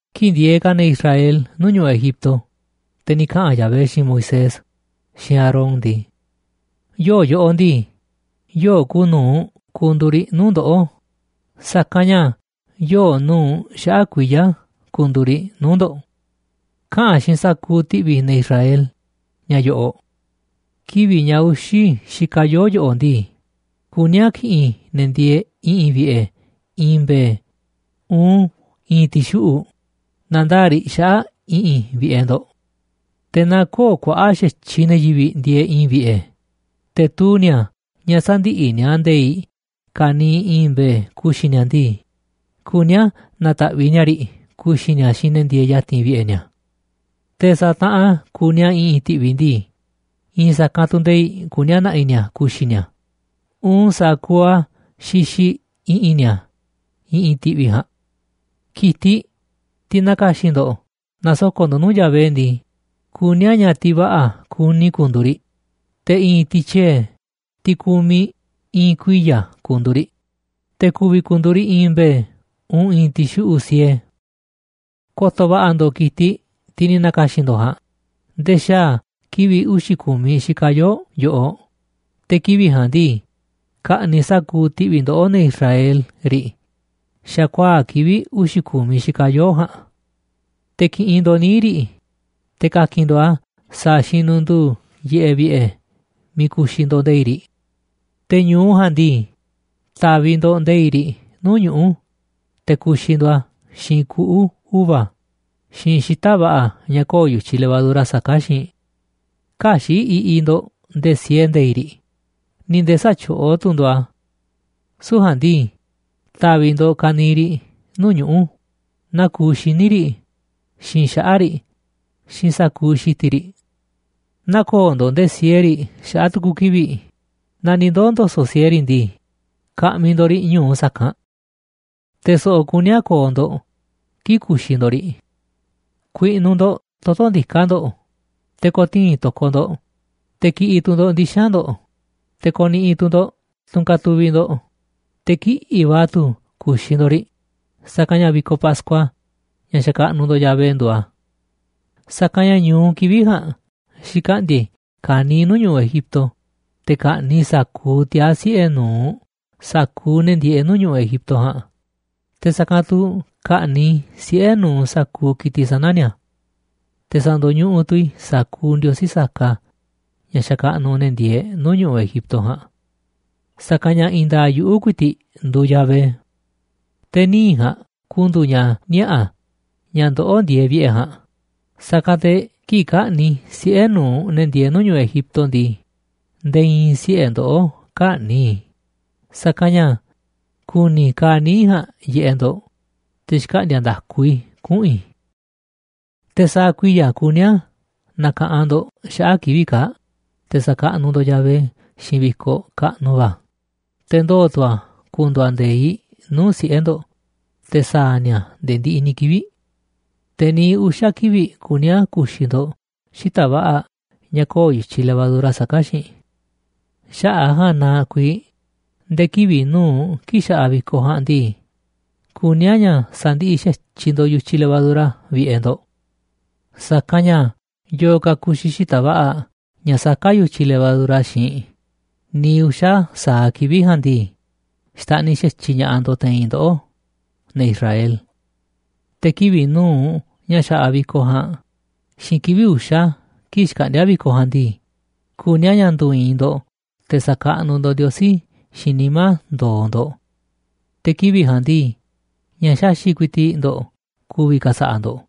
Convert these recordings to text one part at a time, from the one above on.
Kii̱ꞌ ndieeꞌ ka̱ ne̱ Israel nuu̱ꞌ ñu̱ꞌuꞌ Egipto, te̱ ni̱ kaꞌa̱n Yahvé xiinꞌ Moisés xiinꞌ Aarón ndii: ―Yoo̱ꞌ yoꞌoꞌ ndii, yoo̱ꞌ kuuꞌ nu̱uꞌ ku̱ndu̱u̱ riꞌ nuu̱ꞌ ndoꞌó, sa̱kanꞌ ña̱ yoo̱ꞌ nu̱uꞌ xaꞌa̱ꞌ kuiya̱ ku̱ndu̱u̱ riꞌ nuu̱ꞌ ndo̱ꞌ. Kaꞌa̱n xiinꞌ sa̱kuuꞌ ti̱ꞌvi̱ ne̱ Israel ña̱ yo̱ꞌo̱ꞌ: “Kivi̱ꞌ ña̱ uxi̱ xikaꞌ yoo̱ꞌ yoꞌoꞌ ndii, kuní a̱ ki̱ꞌi̱n ne̱ ndieeꞌ i̱ꞌi̱n vi̱ꞌe̱ i̱i̱n mbe̱e̱ uun i̱i̱n ti̱xuꞌu̱ꞌ na̱ndaa̱ꞌ riꞌ xaꞌa̱ꞌ i̱ꞌi̱n vi̱ꞌe̱ ndo̱ꞌ. Te̱ naaꞌ kö̱o̱ꞌ kuaꞌa̱ꞌ xa̱tyiꞌ ne̱ yivi̱ꞌ ndieeꞌ i̱i̱n vi̱ꞌe̱, te̱ tuu ni̱a̱ ña̱ sä̱ndiꞌiꞌ ni̱a̱ nde̱i̱ꞌ ka̱niiꞌ i̱i̱n mbe̱e̱ ku̱xi̱ ni̱a̱ ndii, kuní a̱ na̱ta̱ꞌviꞌ ni̱a̱ riꞌ ku̱xi̱ ni̱a̱ xiinꞌ ne̱ ndieeꞌ ya̱ti̱n vi̱ꞌe̱ ni̱a̱. Te̱ sa̱a̱ taꞌan kuuꞌ ni̱a̱ i̱ꞌi̱n ti̱ꞌvi̱ ndii, i̱i̱n sa̱kanꞌ tu̱ nde̱i̱ꞌ kuní a̱ na̱ꞌi̱ ni̱a̱ ku̱xi̱ ni̱a̱ uun sa̱a̱ kuuꞌ a̱ xixiꞌ i̱ꞌi̱n ni̱a̱ i̱ꞌi̱n ti̱ꞌvi̱ ja̱a̱nꞌ. Ki̱tiꞌ, tiꞌ na̱ka̱xi̱n ndo̱ꞌ na̱soko̱ꞌ ndo̱ꞌ nuu̱ꞌ Yahvé ndii, kuní a̱ ña̱ tiꞌ va̱ꞌa̱ kuni ku̱ndu̱u̱ riꞌ, te̱ i̱i̱n tiꞌ tyiee̱, tiꞌ kumiꞌ i̱i̱n kuiya̱ ku̱ndu̱u̱ riꞌ, te̱ ku̱vi̱ ku̱ndu̱u̱ riꞌ i̱i̱n mbe̱e̱ uun i̱i̱n ti̱xuꞌu̱ꞌ siee. ’Ko̱to̱ va̱ꞌa̱ ndo̱ꞌ ki̱tiꞌ, tiꞌ ni̱ na̱ka̱xi̱n ndo̱ꞌ ja̱a̱nꞌ, nde̱e̱ xaa̱ kivi̱ꞌ uxi̱ ku̱miꞌ xikaꞌ yoo̱ꞌ yoꞌoꞌ, te̱ kivi̱ꞌ ja̱a̱nꞌ ndii, ka̱ꞌni̱ꞌ sa̱kuuꞌ ti̱ꞌvi̱ ndoꞌó, ne̱ Israel, riꞌ xa̱kuaa̱ꞌ kivi̱ꞌ uxi̱ ku̱miꞌ xikaꞌ yoo̱ꞌ ja̱a̱nꞌ. Te̱ ki̱ꞌi̱n ndo̱ꞌ níiꞌ riꞌ, te̱ ka̱ki̱n ndo̱ꞌ a̱ sa̱a̱ xinunduu yiꞌeꞌ vi̱ꞌe̱ miiꞌ ku̱xi̱ ndo̱ꞌ nde̱i̱ꞌ riꞌ. Te̱ ñu̱u ja̱a̱nꞌ ndii, ta̱vi̱ ndo̱ꞌ nde̱i̱ꞌ riꞌ nuu̱ꞌ ñuꞌu̱, te̱ ku̱xi̱ ndo̱ꞌ a̱ xiinꞌ kuꞌu̱ uva̱ xiinꞌ xita̱ꞌ va̱ꞌa̱ ña̱ köo̱ꞌ yu̱tyiꞌ levadura saká xiinꞌ. Kä̱xi̱ꞌ iꞌiꞌ ndo̱ꞌ nde̱e̱ siee nde̱i̱ꞌ riꞌ, ni̱ nde̱e̱ sä̱tyoꞌó tu̱ ndo̱ꞌ a̱. Süu̱ꞌ ja̱a̱nꞌ ndii, ta̱vi̱ ndo̱ꞌ ka̱niiꞌ riꞌ nuu̱ꞌ ñuꞌu̱, naa kuuꞌ xíniꞌ riꞌ, xiinꞌ xaꞌa̱ꞌ riꞌ, xiinꞌ sa̱kuuꞌ xi̱ti̱ riꞌ. Nä̱ko̱o̱ ndo̱ꞌ nde̱e̱ siee riꞌ xaꞌa̱ꞌ tu̱ku̱ kivi̱ꞌ. Naaꞌ ni̱ ndoo̱ ndo̱so̱ꞌ siee riꞌ ndii, ka̱ꞌmi̱ ndo̱ꞌ riꞌ ñu̱u sa̱kanꞌ. ’Te̱ so̱ꞌo̱ kuní a̱ ko̱o̱ ndo̱ꞌ kii̱ꞌ ku̱xi̱ ndo̱ꞌ riꞌ: ku̱i̱ꞌnu̱ ndo̱ꞌ toto̱ ndiká ndo̱ꞌ, te̱ ko̱tii̱n to̱koꞌ ndo̱ꞌ, te̱ ki̱ꞌi̱ tu̱ ndo̱ꞌ ndixa̱nꞌ ndo̱ꞌ, te̱ ko̱ni̱ꞌi̱ tu̱ ndo̱ꞌ tunꞌ katuviꞌ ndo̱ꞌ, te̱ kiꞌi̱ꞌ va̱ tu̱ ku̱xi̱ ndo̱ꞌ riꞌ, sa̱kanꞌ ña̱ vi̱koꞌ Pascua, ña̱ xakaꞌnuꞌ ndo̱ꞌ Yahvé, nduuꞌ a̱. Sa̱kanꞌ ña̱ ñu̱u kivi̱ꞌ ja̱a̱nꞌ xi̱kaꞌndi̱a̱ i̱ ka̱niiꞌ nuu̱ꞌ ñu̱ꞌuꞌ Egipto, te̱ ka̱ꞌni̱ꞌ i̱ sa̱kuuꞌ tiaa̱ siꞌe̱ nu̱uꞌ sa̱kuuꞌ ne̱ ndieeꞌ nuu̱ꞌ ñu̱ꞌuꞌ Egipto ja̱a̱nꞌ, te̱ sa̱kanꞌ tu̱ ka̱ꞌni̱ꞌ i̱ siꞌe̱ nu̱uꞌ sa̱kuuꞌ ki̱tiꞌ sana̱ ni̱a̱. Te̱ sa̱ndo̱ñuꞌuꞌ tu̱ i̱ sa̱kuuꞌ ndiosí saka ña̱ xakaꞌnuꞌ ne̱ ndieeꞌ nuu̱ꞌ ñu̱ꞌuꞌ Egipto ja̱a̱nꞌ. Sa̱kanꞌ ña̱ i̱i̱n nda̱a̱ꞌ yuꞌu̱ ku̱i̱ti̱ꞌ nduuꞌ Yahvé. Te̱ níiꞌ ja̱a̱nꞌ ku̱ndu̱u̱ ña̱ niaꞌa̱ ña̱ ndoꞌó ndieeꞌ vi̱ꞌe̱ ja̱a̱nꞌ, sa̱kanꞌ te̱ kii̱ꞌ ka̱ꞌni̱ꞌ i̱ siꞌe̱ nu̱uꞌ ne̱ ndieeꞌ nuu̱ꞌ ñu̱ꞌuꞌ Egipto ndii, nde̱e̱ i̱i̱n siꞌe̱ ndoꞌó kä̱ꞌni̱ꞌ i̱, sa̱kanꞌ ña̱ ku̱ni̱ i̱ kaaꞌ níiꞌ ja̱a̱nꞌ yiꞌeꞌ ndo̱ꞌ, te̱ xkaꞌndi̱a̱ nda̱ku i̱ kuꞌu̱n i̱. ’Te̱ sa̱a̱ kuiya̱ kuní a̱ na̱ka̱ꞌanꞌ ndo̱ꞌ xaꞌa̱ꞌ kivi̱ꞌ kaa̱ꞌ, te̱ sa̱kaꞌnuꞌ ndo̱ꞌ Yahvé xiinꞌ vi̱koꞌ kaꞌnuꞌ va̱, te̱ ndoo̱ tu̱ a̱ ku̱ndu̱u̱ a̱ nde̱iꞌ nuu̱ꞌ siꞌe̱ ndo̱ꞌ, te̱ sa̱a̱ ni̱a̱ a̱ nde̱e̱ ndiꞌiꞌ ni̱ kivi̱ꞌ. Te̱ niiꞌ uxa̱ kivi̱ꞌ kuní a̱ ku̱xi̱ ndo̱ꞌ xita̱ꞌ va̱ꞌa̱ ña̱ köo̱ꞌ yu̱tyiꞌ levadura saká xiinꞌ. Xaꞌa̱ꞌ a̱ ja̱a̱nꞌ na kuiiꞌ nde̱e̱ kivi̱ꞌ nu̱uꞌ kii̱ꞌ xa̱ꞌaꞌ vi̱koꞌ ja̱a̱nꞌ ndii, kuní a̱ ña̱ sa̱ndiꞌiꞌ xa̱tyiꞌ ndo̱ꞌ yu̱tyiꞌ levadura vi̱ꞌe̱ ndo̱ꞌ. Sa̱kanꞌ ña̱ yo̱o̱ ka̱ ku̱xi̱ xita̱ꞌ va̱ꞌa̱ ña̱ saká yu̱tyiꞌ levadura xiinꞌ niiꞌ uxa̱ sa̱aꞌ kivi̱ꞌ ja̱a̱nꞌ ndii, xta̱ꞌniꞌ xa̱tyiꞌ ña̱ꞌaꞌ ndo̱ꞌ te̱i̱n ndoꞌó, ne̱ Israel. Te̱ kivi̱ꞌ nu̱uꞌ ña̱ xa̱ꞌaꞌ vi̱koꞌ ja̱a̱nꞌ xiinꞌ kivi̱ꞌ uxa̱ kii̱ꞌ xkaꞌndíá vi̱koꞌ ja̱a̱nꞌ ndii, kuní a̱ ña̱ ndu̱i̱i̱n ndo̱ꞌ te̱ sa̱kaꞌnuꞌ ndo̱ꞌ Ndiosí xiinꞌ nimá ndo̱o̱ ndo̱ꞌ. Te̱ kivi̱ꞌ ja̱a̱nꞌ ndii, ña̱ xaxi̱ꞌ ku̱i̱ti̱ꞌ ndo̱ꞌ ku̱vi̱ ka̱sa̱ꞌa̱ ndo̱ꞌ,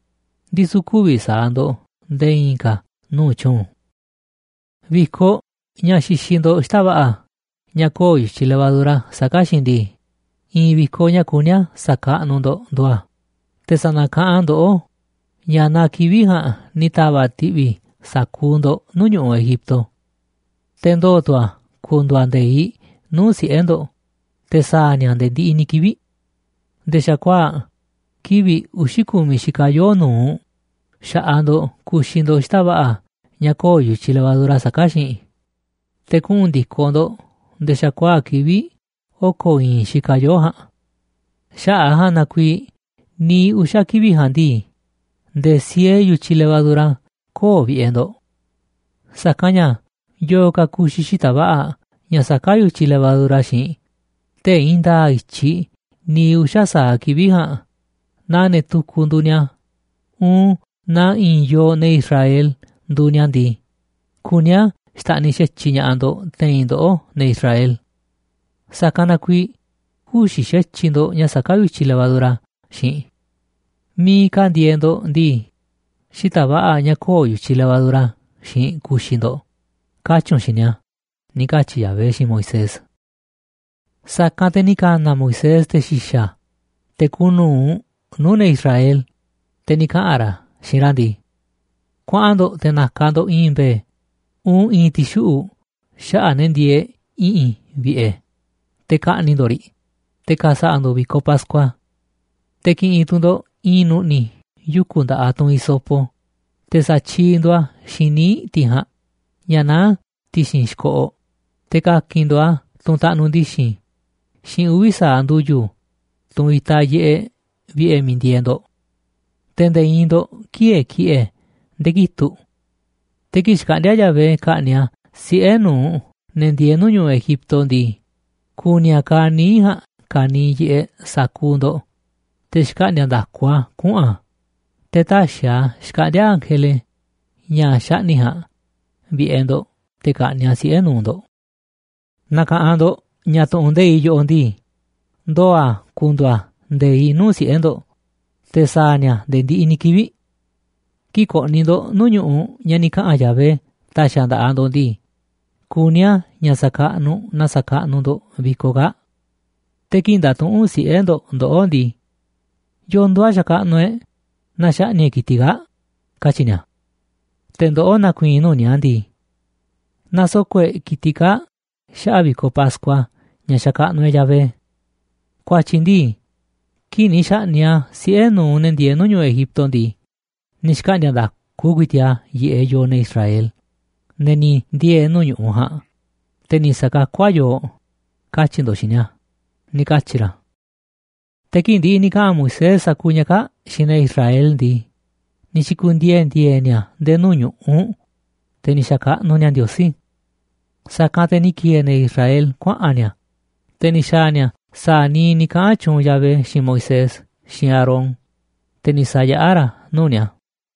ndisu̱ kü̱vi̱ sa̱a̱ ndo̱ꞌ nde̱e̱ i̱i̱n ka̱ nuu̱ꞌ tyuunꞌ. ’Vi̱koꞌ ña̱ xixiꞌ ndo̱ꞌ xita̱ꞌ va̱ꞌa̱ ña̱ köo̱ꞌ yu̱tyiꞌ levadura saká xiinꞌ ndii, i̱i̱n vi̱koꞌ ña̱ kuní a̱ sa̱kaꞌnuꞌ ndo̱ꞌ nduuꞌ a̱, te̱ sa̱na̱kaꞌanꞌ a̱ ndoꞌó ña̱ naa kivi̱ꞌ ja̱a̱nꞌ ni̱ ta̱va̱ꞌ ti̱ꞌvi̱ i̱ sa̱kuuꞌ ndo̱ꞌ nuu̱ꞌ ñu̱ꞌuꞌ Egipto. Te̱ ndoo̱ tu̱ a̱ ku̱ndu̱u̱ a̱ nde̱iꞌ nuu̱ꞌ siꞌe̱ ndo̱ꞌ te̱ sa̱a̱ ni̱a̱ a̱ nde̱e̱ ndiꞌiꞌ ni̱ kivi̱ꞌ. Nde̱e̱ xa̱kuaa̱ꞌ kivi̱ꞌ uxi̱ ku̱miꞌ xikaꞌ yoo̱ꞌ nu̱uꞌ xa̱ꞌaꞌ ndo̱ꞌ ku̱xi̱ ndo̱ꞌ xita̱ꞌ va̱ꞌa̱ ña̱ köo̱ꞌ yu̱tyiꞌ levadura saká xiinꞌ, te̱ kuꞌu̱n ndi̱koꞌ ndo̱ꞌ nde̱e̱ xa̱kuaa̱ꞌ kivi̱ꞌ oko̱ i̱i̱n xikaꞌ yoo̱ꞌ ja̱a̱nꞌ. Xaꞌa̱ꞌ a̱ ja̱a̱nꞌ na kuiiꞌ niiꞌ uxa̱ kivi̱ꞌ ja̱a̱nꞌ ndii, nde̱e̱ siee yu̱tyiꞌ levadura köo̱ꞌ vi̱ꞌe̱ ndo̱ꞌ. Sa̱kanꞌ ña̱ yo̱o̱ ka̱ ku̱xi̱ xita̱ꞌ va̱ꞌa̱ ña̱ saká yu̱tyiꞌ levadura xiinꞌ tee̱ꞌ i̱i̱n nda̱a̱ꞌ i̱tyiꞌ niiꞌ uxa̱ sa̱aꞌ kivi̱ꞌ ja̱a̱nꞌ naaꞌ ne̱ tukuꞌ nduuꞌ ni̱a̱, uun naaꞌ i̱i̱n yooꞌ ne̱ Israel nduuꞌ ni̱a̱ ndii, kuní a̱ xta̱ꞌniꞌ xa̱tyiꞌ ña̱ꞌaꞌ ndo̱ꞌ te̱i̱n ndoꞌó, ne̱ Israel. Sa̱kanꞌ na kuiiꞌ kü̱xi̱ xa̱tyiꞌ ndo̱ꞌ ña̱ saká yu̱tyiꞌ levadura xiinꞌ. Miiꞌ ka̱ ndieeꞌ ndo̱ꞌ ndii, xita̱ꞌ va̱ꞌa̱ ña̱ köo̱ꞌ yu̱tyiꞌ levadura xiinꞌ ku̱xi̱ ndo̱ꞌ”, katyi̱ u̱nꞌ xiinꞌ ni̱a̱ ―ni̱ katyi̱ Yahvé xiinꞌ Moisés. Sa̱kanꞌ te̱ ni̱ ka̱na̱ Moisés te̱ xi̱xa̱, te̱ kuuꞌ nu̱uꞌ nuu̱ꞌ ne̱ Israel, te̱ ni̱ kaꞌa̱n ra̱ xiinꞌ ra̱ ndii: ―Kuaꞌan ndo̱ꞌ te̱ na̱ka̱ ndo̱ꞌ i̱i̱n mbe̱e̱ uun i̱i̱n ti̱xuꞌu̱ꞌ xaꞌa̱ꞌ ne̱ ndieeꞌ i̱ꞌi̱n vi̱ꞌe̱, te̱ ka̱ꞌni̱ꞌ ndo̱ꞌ riꞌ, te̱ ka̱sa̱ꞌa̱ ndo̱ꞌ vi̱koꞌ Pascua. Te̱ ki̱ꞌi̱n tu̱ ndo̱ꞌ i̱i̱n nu̱ꞌni̱ yuku̱ nda̱ꞌaꞌ tunꞌ hisopo, te̱ sa̱tyiiꞌ ndooꞌ a̱ xiinꞌ níiꞌ tiꞌ ja̱a̱nꞌ ña̱ naá ti̱xi̱n xi̱koꞌoꞌ, te̱ ka̱ki̱n ndo̱ꞌ a̱ tunꞌ taꞌnuꞌ ndi̱xi̱n xiinꞌ uvi̱ sa̱aꞌ ndu̱yu̱, tunꞌ itaꞌ yiꞌeꞌ vi̱ꞌe̱ miiꞌ ndieeꞌ ndo̱ꞌ. Te̱ nde̱e̱ i̱i̱n ndo̱ꞌ kï̱e̱e̱ ki̱ꞌe̱ nde̱e̱ kitu̱ꞌ. Te̱ kii̱ꞌ xkaꞌndi̱a̱ Yahvé ka̱ꞌni̱ꞌ a̱ siꞌe̱ nu̱uꞌ ne̱ ndieeꞌ nuu̱ꞌ ñu̱ꞌuꞌ Egipto ndii, ku̱ni̱ a̱ kaaꞌ níiꞌ ja̱a̱nꞌ ka̱niiꞌ yiꞌeꞌ sa̱kuuꞌ ndo̱ꞌ, te̱ xkaꞌndi̱a̱ nda̱ku a̱ kuꞌu̱n a̱, te̱ tä̱xi̱ a̱ xkaꞌndi̱a̱ ángele, ña̱ xaꞌni̱ꞌ ja̱a̱nꞌ, vi̱ꞌe̱ ndo̱ꞌ te̱ ka̱ꞌni̱ꞌ a̱ siꞌe̱ nu̱uꞌ ndo̱ꞌ. ’Na̱ka̱ꞌanꞌ ndo̱ꞌ ña̱ tu̱ꞌu̱n nde̱iꞌ yoꞌoꞌ ndii, ndoo̱ a̱ ku̱ndu̱u̱ a̱ nde̱iꞌ nuu̱ꞌ siꞌe̱ ndo̱ꞌ te̱ sa̱a̱ ni̱a̱ a̱ nde̱e̱ ndiꞌiꞌ ni̱ kivi̱ꞌ. Kii̱ꞌ ko̱ꞌni̱ ndo̱ꞌ nuu̱ꞌ ñu̱ꞌuꞌ ña̱ ni̱ kaꞌa̱n Yahvé ta̱xi̱ a̱ nda̱ꞌaꞌ ndo̱ꞌ ndii, kuní a̱ ña̱ sa̱kaꞌnuꞌ naa sa̱kaꞌnuꞌ ndo̱ꞌ vi̱koꞌ kaa̱ꞌ. Te̱ kii̱ꞌ nda̱tuꞌu̱nꞌ siꞌe̱ ndo̱ꞌ ndoꞌó ndii: “¿Yo̱o̱ nduuꞌ a̱ xakaꞌnuꞌ e̱ꞌ naaꞌ xaꞌni̱ꞌ e̱ꞌ ki̱tiꞌ kaa̱ꞌ?”, katyi̱ ni̱a̱. Te̱ ndoꞌó na̱ku̱i̱i̱n nuu̱ꞌ ni̱a̱ ndii: “Nasoko̱ꞌ e̱ꞌ ki̱tiꞌ kaa̱ꞌ xaꞌa̱ꞌ vi̱koꞌ Pascua ña̱ xakaꞌnuꞌ e̱ꞌ Yahvé. Ku̱a̱tyi̱ ndii, kii̱ꞌ ni̱ xa̱ꞌni̱ꞌ a̱ siꞌe̱ nu̱uꞌ ne̱ ndieeꞌ nuu̱ꞌ ñu̱ꞌuꞌ Egipto ndii, ni̱ xkaꞌndi̱a̱ nda̱ku ku̱i̱ti̱ꞌ a̱ yiꞌeꞌ yooꞌ, ne̱ Israel, ne̱ ni̱ ndiee̱ nuu̱ꞌ ñu̱ꞌuꞌ ja̱a̱nꞌ, te̱ ni̱ sa̱kakú a̱ yooꞌ”, katyi̱ ndo̱ꞌ xiinꞌ ni̱a̱ ―ni̱ katyi̱ ra̱. Te̱ kii̱ꞌ ndi̱ꞌi̱ ni̱ kaꞌa̱n Moisés sa̱kuuꞌ ña̱ kaa̱ꞌ xiinꞌ ne̱ Israel ndii, ni̱ xi̱ku̱ndiee̱ ndi̱e̱e̱ ni̱a̱ nde̱e̱ nuu̱ꞌ ñu̱ꞌuꞌ, te̱ ni̱ xakaꞌnuꞌ ni̱a̱ Ndiosí. Sa̱kanꞌ te̱ ni̱ ki̱e̱e̱ ne̱ Israel kuaꞌa̱n ni̱a̱, te̱ ni̱ xa̱a̱ ni̱a̱ sa̱a̱ niiꞌ ni̱ kaꞌa̱n tyuunꞌ Yahvé xiinꞌ Moisés xiinꞌ Aarón, te̱ ni̱ sa̱yaꞌá ra̱ a̱ nuu̱ꞌ ni̱a̱.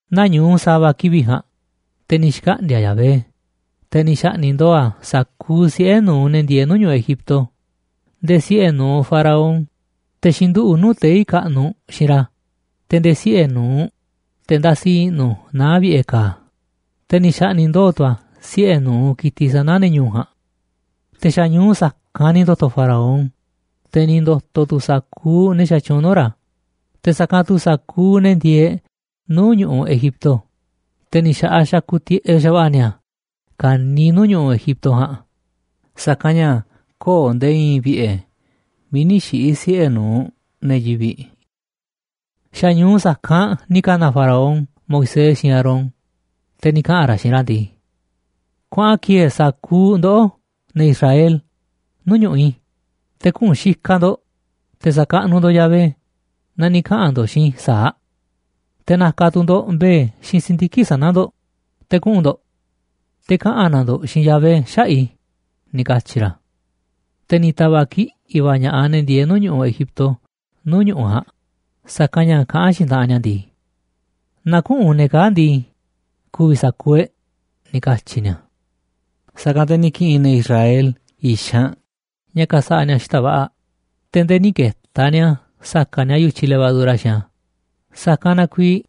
Nañu̱u sa̱va̱ kivi̱ꞌ ja̱a̱nꞌ, te̱ ni̱ xkaꞌndi̱a̱ Yahvé, te̱ ni̱ xa̱ꞌni̱ꞌ ndooꞌ a̱ sa̱kuuꞌ siꞌe̱ nu̱uꞌ ne̱ ndieeꞌ nuu̱ꞌ ñu̱ꞌuꞌ Egipto nde̱e̱ siꞌe̱ nu̱uꞌ Faraón, te̱ xinduꞌu̱ꞌ nuu̱ꞌ tei̱ kaꞌnuꞌ xiinꞌ ra̱, te̱ nde̱e̱ siꞌe̱ nu̱uꞌ te̱ ndasi i̱ꞌnu̱ naá vi̱ꞌe̱ ka̱a̱, te̱ ni̱ xa̱ꞌni̱ꞌ ndooꞌ tu̱ a̱ siꞌe̱ nu̱uꞌ ki̱tiꞌ sana̱ ne̱ ñu̱u̱ ja̱a̱nꞌ. Te̱ xa̱ ñu̱u sa̱kanꞌ ni̱ ndo̱to̱ Faraón, te̱ ni̱ ndo̱to̱ tu̱ sa̱kuuꞌ ne̱ xatyuunꞌ nuu̱ꞌ ra̱, te̱ sa̱kanꞌ tu̱ sa̱kuuꞌ ne̱ ndieeꞌ nuu̱ꞌ ñu̱ꞌuꞌ Egipto, te̱ ni̱ xa̱ꞌaꞌ xakuꞌ tiꞌeꞌ xa̱va̱ꞌa̱ ni̱a̱ ka̱niiꞌ nuu̱ꞌ ñu̱ꞌuꞌ Egipto ja̱a̱nꞌ, sa̱kanꞌ ña̱ köo̱ꞌ nde̱e̱ i̱i̱n vi̱ꞌe̱ miiꞌ nï̱ xiꞌi̱ siꞌe̱ nu̱uꞌ ne̱ yivi̱ꞌ. Xa̱ ñu̱u sa̱kanꞌ ni̱ ka̱na̱ Faraón Moisés xiinꞌ Aarón, te̱ ni̱ kaꞌa̱n ra̱ xiinꞌ ra̱ ndii: ―Kuaꞌan ki̱e̱e̱ sa̱kuuꞌ ndoꞌó, ne̱ Israel, nuu̱ꞌ ñu̱ꞌuꞌ i̱, te̱ kuꞌu̱n xikaꞌ ndo̱ꞌ, te̱ sa̱kaꞌnuꞌ ndo̱ꞌ Yahvé naa ni̱ kaꞌa̱n ndo̱ꞌ xiinꞌ i̱ sa̱aꞌ. Te̱ na̱ka̱ tu̱ ndo̱ꞌ mbe̱e̱ xiinꞌ si̱ndiki̱ꞌ sana̱ ndo̱ꞌ, te̱ kuꞌu̱n ndo̱ꞌ. Te̱ kaꞌa̱n na̱ ndo̱ꞌ xiinꞌ Yahvé xaꞌa̱ꞌ i̱ ―ni̱ katyi̱ ra̱. Te̱ ni̱ ta̱va̱ꞌ kiꞌi̱ꞌ va̱ ña̱ꞌaꞌ ne̱ ndieeꞌ nuu̱ꞌ ñu̱ꞌuꞌ Egipto nuu̱ꞌ ñu̱ꞌuꞌ ja̱a̱nꞌ, sa̱kanꞌ ña̱ kaꞌán xiinꞌ taꞌanꞌ ni̱a̱ ndii: ―Naaꞌ küꞌu̱n ne̱ kaa̱ꞌ ndii, ku̱vi̱ sa̱kuuꞌ e̱ꞌ ―ni̱ katyi̱ ni̱a̱. Sa̱kanꞌ te̱ ni̱ ki̱ꞌi̱n ne̱ Israel i̱xanꞌ ña̱ ka̱sa̱ꞌa̱ ni̱a̱ xita̱ꞌ va̱ꞌa̱, te̱ nde̱e̱ nï̱ ke̱ta̱ ni̱a̱ sa̱ka̱ꞌ ni̱a̱ yu̱tyiꞌ levadura xiinꞌ a̱, sa̱kanꞌ na kuiiꞌ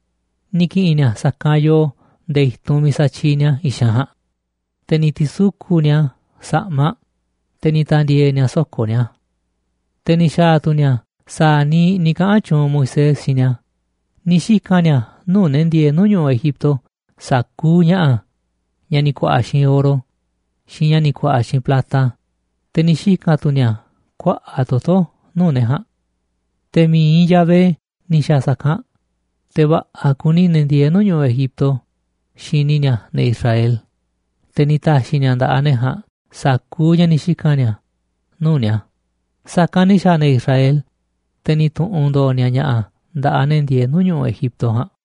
ni̱ ki̱ꞌi̱n ni̱a̱ sa̱kanꞌ yoo nde̱e̱ i̱tunꞌ miiꞌ satyiiꞌ ni̱a̱ i̱xanꞌ ja̱a̱nꞌ, te̱ ni̱ ti̱suku̱ꞌ ni̱a̱ a̱ sa̱ꞌmaꞌ, te̱ ni̱ ta̱ndi̱e̱e̱ ni̱a̱ soko̱ ni̱a̱. Te̱ ni̱ xa̱a̱ tu̱ ni̱a̱ sa̱a̱ niiꞌ ni̱ kaꞌa̱n tyuunꞌ Moisés xiinꞌ ni̱a̱, ni̱ xika̱n ni̱a̱ nuu̱ꞌ ne̱ ndieeꞌ nuu̱ꞌ ñu̱ꞌuꞌ Egipto sa̱kuuꞌ ña̱ꞌa̱ ña̱ ni̱ ku̱a̱ꞌa̱ xiinꞌ oro xiinꞌ ña̱ ni̱ ku̱a̱ꞌa̱ xiinꞌ plata, te̱ ni̱ xika̱n tu̱ ni̱a̱ kuaꞌa̱ꞌ toto̱ nuu̱ꞌ ne̱ ja̱a̱nꞌ. Te̱ mi̱iꞌ Yahvé ni̱ xa̱a̱ sa̱kanꞌ, te̱ va̱ꞌa̱ kuni ne̱ ndieeꞌ nuu̱ꞌ ñu̱ꞌuꞌ Egipto xini ni̱a̱ ne̱ Israel, te̱ ni̱ ta̱xi̱ ni̱a̱ nda̱ꞌaꞌ ne̱ ja̱a̱nꞌ sa̱kuuꞌ ña̱ ni̱ xika̱n ni̱a̱ nuu̱ꞌ ni̱a̱, sa̱kanꞌ ni̱ xa̱a̱ ne̱ Israel, te̱ ni̱ tu̱ꞌu̱n ndo̱o̱ ni̱a̱ ña̱ꞌa̱ nda̱ꞌaꞌ ne̱ ndieeꞌ nuu̱ꞌ ñu̱ꞌuꞌ Egipto ja̱a̱nꞌ.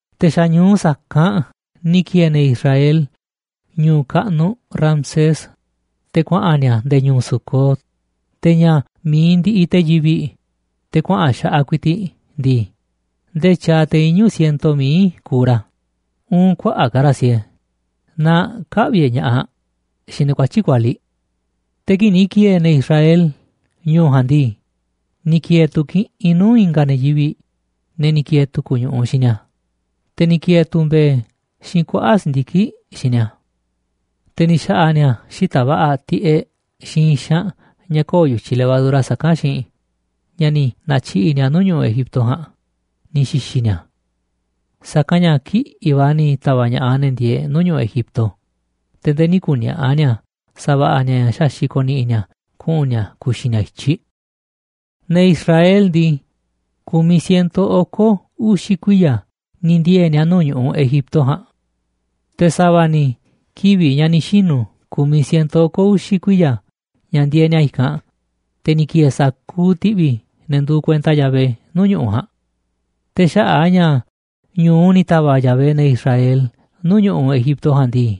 Te̱ xa̱ ñu̱u sa̱kanꞌ ni̱ ki̱e̱e̱ ne̱ Israel ñu̱u̱ kaꞌnuꞌ Ramsés, te̱ kuaꞌa̱n ni̱a̱ nde̱e̱ ñu̱u̱ Sucot. Te̱ ña̱ mi̱iꞌ ndiꞌiꞌ te̱ yivi̱ꞌ, te̱ kuaꞌa̱n xaꞌaꞌ ku̱i̱ti̱ꞌ ndii, ndee tyaaꞌ te̱ iñu̱ siento mií kuuꞌ ra̱, uun kuaꞌa̱ꞌ ka̱ ra̱ siee naaꞌ kä̱ꞌvi̱ e̱ꞌ ña̱ꞌaꞌ xiinꞌ ne̱ kuatyi̱ꞌ kualiꞌ. Te̱ kii̱ꞌ ni̱ ki̱e̱e̱ ne̱ Israel ñu̱u̱ ja̱a̱nꞌ ndii, ni̱ ki̱e̱e̱ tu̱ kiꞌinꞌ nuu̱ꞌ i̱nga̱ ne̱ yivi̱ꞌ, ne̱ ni̱ ki̱e̱e̱ tu̱ku̱ ñu̱ꞌuꞌ xiinꞌ ni̱a̱, te̱ ni̱ ki̱e̱e̱ tu̱ mbe̱e̱ xiinꞌ kuaꞌa̱ꞌ si̱ndiki̱ꞌ xiinꞌ ni̱a̱. Te̱ ni̱ xa̱ꞌa̱ ni̱a̱ xita̱ꞌ va̱ꞌa̱ tiꞌeꞌ xiinꞌ i̱xanꞌ ña̱ köo̱ꞌ yu̱tyiꞌ levadura saká xiinꞌ ña̱ ni̱ na̱tyiꞌi̱ꞌ ni̱a̱ nuu̱ꞌ ñu̱ꞌuꞌ Egipto ja̱a̱nꞌ ni̱ xi̱xi̱ ni̱a̱. Sa̱kanꞌ ña̱ kiꞌi̱ꞌ va̱ ni̱ ta̱va̱ꞌ ña̱ꞌaꞌ ne̱ ndieeꞌ nuu̱ꞌ ñu̱ꞌuꞌ Egipto, te̱ nde̱e̱ nï̱ ku̱ni̱a̱ꞌa̱ ni̱a̱ sa̱va̱ꞌa̱ ni̱a̱ ña̱ xaxi̱ꞌ ko̱ni̱ꞌi̱ ni̱a̱ kuꞌu̱n ni̱a̱ ku̱xi̱ ni̱a̱ i̱tyiꞌ. Ne̱ Israel ndii, kumiꞌ siento oko̱ uxi̱ kuiya̱ ni̱ ndiee̱ ni̱a̱ nuu̱ꞌ ñu̱ꞌuꞌ Egipto ja̱a̱nꞌ. Te̱ sa̱va̱ ni̱ kivi̱ꞌ ña̱ ni̱ xinu̱ ku̱miꞌ siento oko̱ uxi̱ kuiya̱ ña̱ ndieeꞌ ni̱a̱ i̱kanꞌ, te̱ ni̱ ki̱e̱e̱ sa̱kuuꞌ ti̱ꞌvi̱ ne̱ nduuꞌ kuenta Yahvé nuu̱ꞌ ñu̱ꞌuꞌ ja̱a̱nꞌ. Te̱ xaꞌa̱ꞌ a̱ ña̱ ñu̱u ni̱ ta̱va̱ꞌ Yahvé ne̱ Israel nuu̱ꞌ ñu̱ꞌuꞌ Egipto ja̱a̱nꞌ ndii,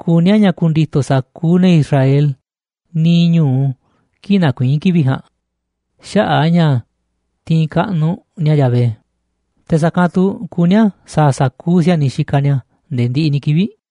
kuní a̱ ña̱ ku̱ndi̱to̱ sa̱kuuꞌ ne̱ Israel niiꞌ ñu̱u kii̱ꞌ nakuiín kivi̱ꞌ ja̱a̱nꞌ xaꞌa̱ꞌ a̱ ña̱ tiinꞌ kaꞌnuꞌ ni̱a̱ Yahvé, te̱ sa̱kanꞌ tu̱ kuní a̱ sa̱a̱ sa̱kuuꞌ si̱a̱niꞌ xikaꞌ ni̱a̱ nde̱e̱ ndiꞌiꞌ ni̱ kivi̱ꞌ.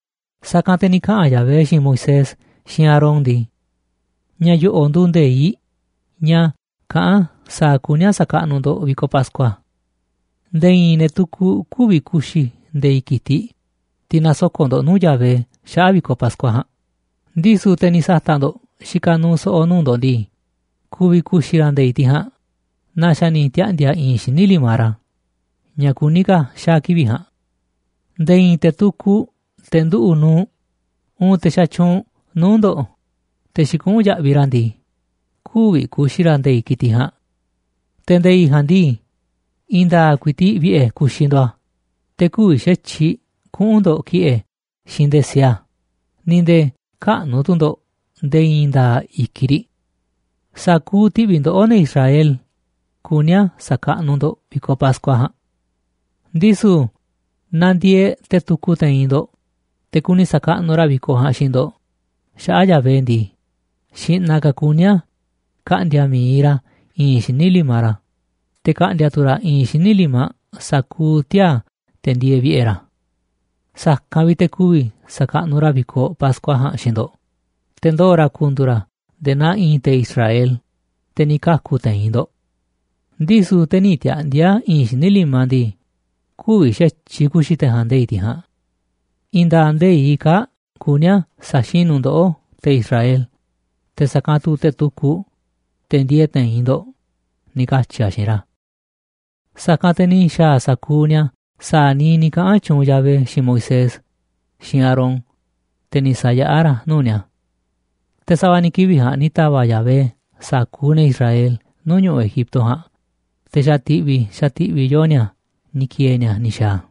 Sa̱kanꞌ te̱ ni̱ kaꞌa̱n Yahvé xiinꞌ Moisés xiinꞌ Aarón ndii: ―Ña̱ yo̱ꞌo̱ꞌ nduuꞌ nde̱iꞌ ña̱ kaꞌán sa̱a̱ kuní a̱ sa̱kaꞌnuꞌ ndo̱ꞌ vi̱koꞌ Pascua: Nde̱e̱ i̱i̱n ne̱ tukuꞌ kü̱vi̱ ku̱xi̱ nde̱i̱ꞌ ki̱tiꞌ, tiꞌ nasoko̱ꞌ ndo̱ꞌ nuu̱ꞌ Yahvé xaꞌa̱ꞌ vi̱koꞌ Pascua ja̱a̱nꞌ, ndisu̱ te̱ ni̱ sa̱ta̱ꞌ ndo̱ꞌ xikaꞌ nuuꞌ so̱ꞌo̱ nuu̱ꞌ ndo̱ꞌ ndii, ku̱vi̱ ku̱xi̱ ra̱ nde̱i̱ꞌ tiꞌ ja̱a̱nꞌ naaꞌ xa̱ ni̱ tiaꞌndi̱a̱ i̱i̱nꞌ xíniꞌ limaꞌ ra̱ ña̱ kuní ka̱ xaa̱ kivi̱ꞌ ja̱a̱nꞌ. Nde̱e̱ i̱i̱n te̱ tukuꞌ, te̱ nduꞌu̱ꞌ nuuꞌ, uun te̱ xatyuunꞌ nuu̱ꞌ ndo̱ꞌ, te̱ xikuꞌún yaꞌviꞌ ra̱ ndii, kü̱vi̱ ku̱xi̱ ra̱ nde̱i̱ꞌ ki̱tiꞌ ja̱a̱nꞌ. Te̱ nde̱i̱ꞌ ja̱a̱nꞌ ndii, i̱i̱n nda̱a̱ꞌ ku̱i̱ti̱ꞌ vi̱ꞌe̱ ku̱xi̱ ndo̱ꞌ a̱, te̱ kü̱vi̱ xa̱tyiꞌ kuꞌu̱n ndo̱ꞌ ki̱ꞌe̱ xiinꞌ nde̱e̱ siee a̱, ni̱ nde̱e̱ käꞌnu̱ tu̱ ndo̱ꞌ nde̱e̱ i̱i̱n nda̱a̱ꞌ i̱kiꞌ riꞌ. Sa̱kuuꞌ ti̱ꞌvi̱ ndoꞌó, ne̱ Israel, kuní a̱ sa̱kaꞌnuꞌ ndo̱ꞌ vi̱koꞌ Pascua ja̱a̱nꞌ. ’Ndisu̱ naaꞌ ndieeꞌ te̱ tukuꞌ te̱i̱n ndo̱ꞌ, te̱ kuni sa̱kaꞌnuꞌ ra̱ vi̱koꞌ ja̱a̱nꞌ xiinꞌ ndo̱ꞌ xaꞌa̱ꞌ Yahvé ndii, xi̱ꞌna̱ ka̱ kuní a̱ ka̱ꞌndi̱a̱ mi̱iꞌ ra̱ i̱i̱nꞌ xíniꞌ limaꞌ ra̱, te̱ ka̱ꞌndi̱a̱ tu̱ ra̱ i̱i̱nꞌ xíniꞌ limaꞌ sa̱kuuꞌ tiaa̱, te̱ ndieeꞌ vi̱ꞌe̱ ra̱. Sa̱kanꞌ vi̱ꞌ te̱ ku̱vi̱ sa̱kaꞌnuꞌ ra̱ vi̱koꞌ Pascua ja̱a̱nꞌ xiinꞌ ndo̱ꞌ, te̱ ndoo̱ ra̱ ku̱ndu̱u̱ ra̱ nde̱e̱ naa i̱i̱n te̱ Israel, te̱ ni̱ ka̱ku̱ te̱i̱n ndo̱ꞌ. Ndisu̱ te̱ nï̱ tiaꞌndi̱a̱ i̱i̱nꞌ xíniꞌ limaꞌ ndii, kü̱vi̱ xa̱tyiꞌ ku̱xi̱ te̱ ja̱a̱nꞌ nde̱i̱ꞌ tiꞌ ja̱a̱nꞌ. I̱i̱n nda̱a̱ꞌ nde̱iꞌ kaa̱ꞌ kuní a̱ sa̱xinu̱ ndoꞌó, te̱ Israel, te̱ sa̱kanꞌ tu̱ te̱ tukuꞌ, te̱ ndieeꞌ te̱i̱n ndo̱ꞌ ―ni̱ katyi̱ a̱ xiinꞌ ra̱. Sa̱kanꞌ te̱ ni̱ xa̱a̱ sa̱kuuꞌ ni̱a̱ sa̱a̱ niiꞌ ni̱ kaꞌa̱n tyuunꞌ Yahvé xiinꞌ Moisés xiinꞌ Aarón, te̱ ni̱ sa̱yaꞌá ra̱ a̱ nuu̱ꞌ ni̱a̱. Te̱ sa̱va̱ ni̱ kivi̱ꞌ ja̱a̱nꞌ ni̱ ta̱va̱ꞌ Yahvé sa̱kuuꞌ ne̱ Israel nuu̱ꞌ ñu̱ꞌuꞌ Egipto ja̱a̱nꞌ, te̱ xa̱ ti̱ꞌvi̱, xa̱ ti̱ꞌvi̱ yoo ni̱a̱ ni̱ ki̱e̱e̱ ni̱a̱ ni̱ xa̱a̱ a̱.